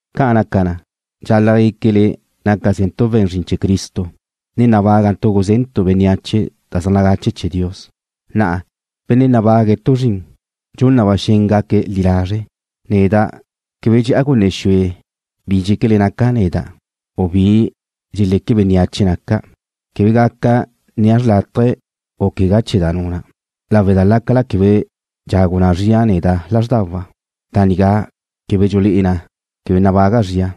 Ca' naca na, dxal-la' guéquele nácazentu' we̱n zrin chee̱ Cristo, ne nabágantu' gusé̱dentu' bénneache da zaj nagache chee̱ Dios. Na'a, benne' nabague̱' tu zrin, dxun na ba xen gaque̱' li lazre'. Neda' quebe dxe'a gunne xue bi dxéquele naca' neda', u bi dxeleque bénneache naca'. Quebe gaca nnia' xrlátaje u quegá chee̱ da nuna' lawe' da lácala quebe dxagu na zria neda' lázrdawa', da nigá quebe dxulé'e na quebe nabaga' zria.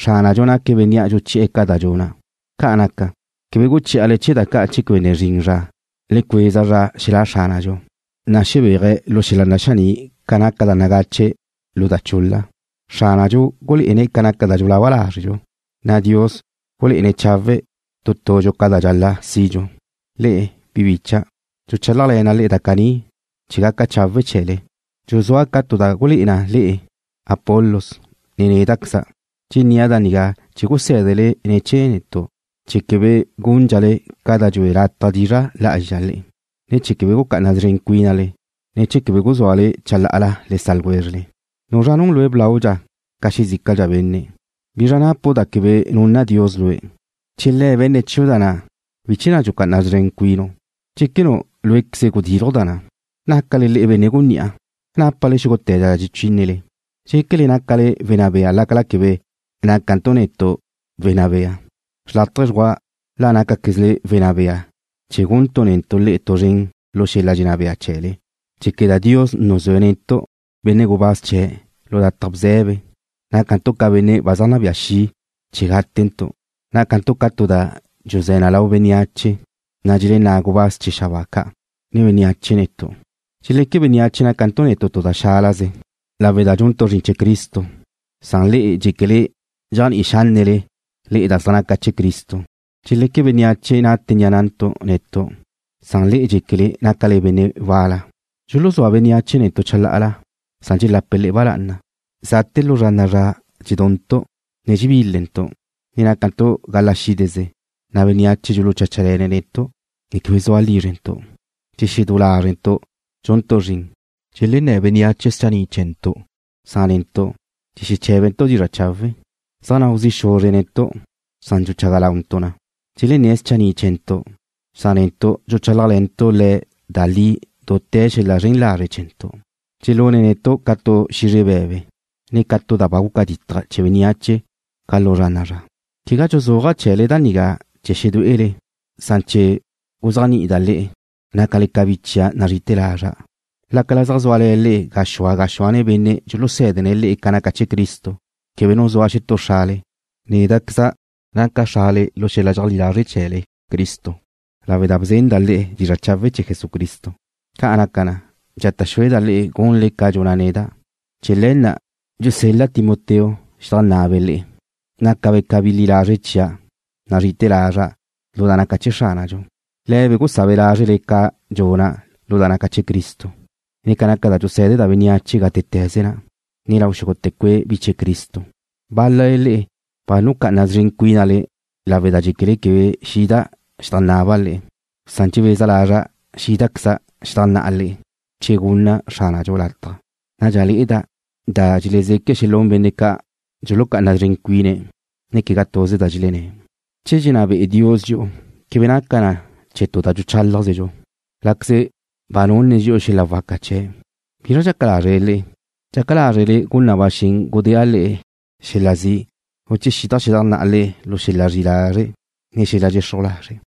Xránadxu naque̱' Benne' dxuchi'e̱ ca da dxuna'. Ca' naca na, quebe guchí'ale chee̱ da ca' che quebe ne zrin zra. Le cueza zra xelá' Xránadxu, na' xebéaje̱' lu xel-la naxaní' ca naca da nagache lu da chul-la. Xránadxu gulé'ene̱' ca naca da dxulaba lázredxu, na' Dios gulé'ene̱' chawe' tu tudxu ca da dxal-la' sidxu. Le'e, bi bicha', dxuchálajle̱na' le'e da caní chee̱ gaca chawe' chee̱le, dxuzúa' ca tu da gulé'e na le'e Apolos, ne néda'queza'. Dxennía' da nigá chee̱ gusé̱dele ne̱ chee̱ netu' chee̱ quebe gundxale ca da dxue lataj dizra' lá'azxa le'e, ne chee̱ quebe gucá'ana szren cuínale, ne chee̱ quebe guzúale chalá'ala le sa' ljwézrele. ¿Nuzra nun lue' blaudxa ca xezícadxa benne'? ¿Bizra napu' da quebe nunna Dios lue'? Che Le̱' be̱nne̱' chiu' da na', ¿bizr chee̱ na' dxucá'ana szren cuinu', dxéquenu' lué'queze gudilju' da na'? ¿Nácale le'e benne' gunní'a? ¿Nápale xúgute̱ da dxechínele? ¿Dxequele nácale wenná bea lácala quebe nácantu' netu' wenná bea? Xrlátaje dxgua la nácaquezle wenná bea chee̱ guntu' netu' le'e tu zren lu xel-la dxenná bea chee̱le. Dxéqueda' Dios nuzúe̱' netu', benne' gubáz chee̱', lu lataj bze̱be. Nácantu' ca benne' ba zaj nabía xi' chee̱ gátentu'. Nácantu' ca tu da dxuzé̱ na lau bénneache, na' dxelenná' gubáz chee̱ xabáa ca', ne bénneache netu'. Dxeleque bénneache nácantu' netu' tu da xálaze lawe' da dxuntu' zrin chee̱ Cristo, san le'e dxéquele dxéajni'i xánnele da zaj naca chee̱ Cristo. Dxeleque bénneache nate ni'a na'ntu' netu' san le'e dxéquele nácale le'e benne' wal-la. Dxuluzúa bénneache netu' chalá'ala, san dxelape̱' le'e ba lá'ana. Ga bzrinte̱ lu zra na'a zra dxeduntu', ne dxebílentu', ne nácantu' gala xídeze, na' bénneache dxulucháchale̱ne̱' netu', ne quebe zua lízrentu'. Dxexedú lázrentu' dxuntu' zrin. Dxelenné̱ bénneache schanni' chee̱ntu', san netu' dxexeché̱bentu' dizra' chawe'. Zaj nau zi' xuzre̱' netu' san dxuchaga launtu' na. Dxelenné̱' schanni' chee̱ntu', san netu' dxuchálajle̱ntu' le̱' da li dute̱ xel-la zren lazre' chee̱ntu'. Dxelune̱' netu' ca tu xizre be̱be, ne ca tu da ba guca ditaj chee̱ bénneache ca lu zra na'a zra. Quegá dxuzúaja' chee̱le da nigá chee̱ xedué'ele, san chee̱ guzéajni'ida' le'e, nácale ca bi chia' nazri'ite̱ lazra'. Lácala zaj zúale̱ le'e gaxúa gaxúane benne' dxulusé̱dene̱' le'e ca naca chee̱ Cristo, quebe nu zua xetú xrale. Néda'queza' naca' xrale lu xel-la dxeajlí lazre' chee̱le Cristo lawe' da bzenda' le'e dizra' chawe' chee̱ Jesucristo. Ca' naca na, dxata' xúeda' le'e gunle ca dxuna' neda'. Chee̱ le̱ na' dxusel-la' Timoteo xedajná'abe' le'e, nácabe' ca bi li lazre' chia' nazri'ite̱ lazra', lu da naca chee̱ Xránadxu. Le̱be' gusá'abe' lázrele ca dxuna' lu da naca chee̱ Cristo, ne ca naca da dxusé̱deda' bénneache gátete̱ze na', ne lau xúgute̱ cue' bi chee̱ Cristo. Bál-lale le'e ba nucá'ana szren cuínale lawe' da dxéquele quebe xida' xedajnnaba' le'e, san dxebeza lazra' xídazequeza' xedajnná'a le'e che gunna Xránadxu lataj. Nadxa le'eda' da dxelezeque' xelún benne' ca' dxulucá'ana szren cuine̱', ne quegá tuze da dxelenné̱'. Che dxenná be'e Dios dxi'u quebe naca na chee̱ tu da dxuchálajzedxu. Lé̱caze̱' ba nunne̱' dxi'u xel-la waca chee̱'. ¿Bizra dxaca lázrele le'e? ¿Dxaca lázrele gun na ba xen gudéa' le'e xel-la zi', u che xida' xedajnná'a le'e lu xel-la zri'i lazre', ne xel-la dxexruj lazre'?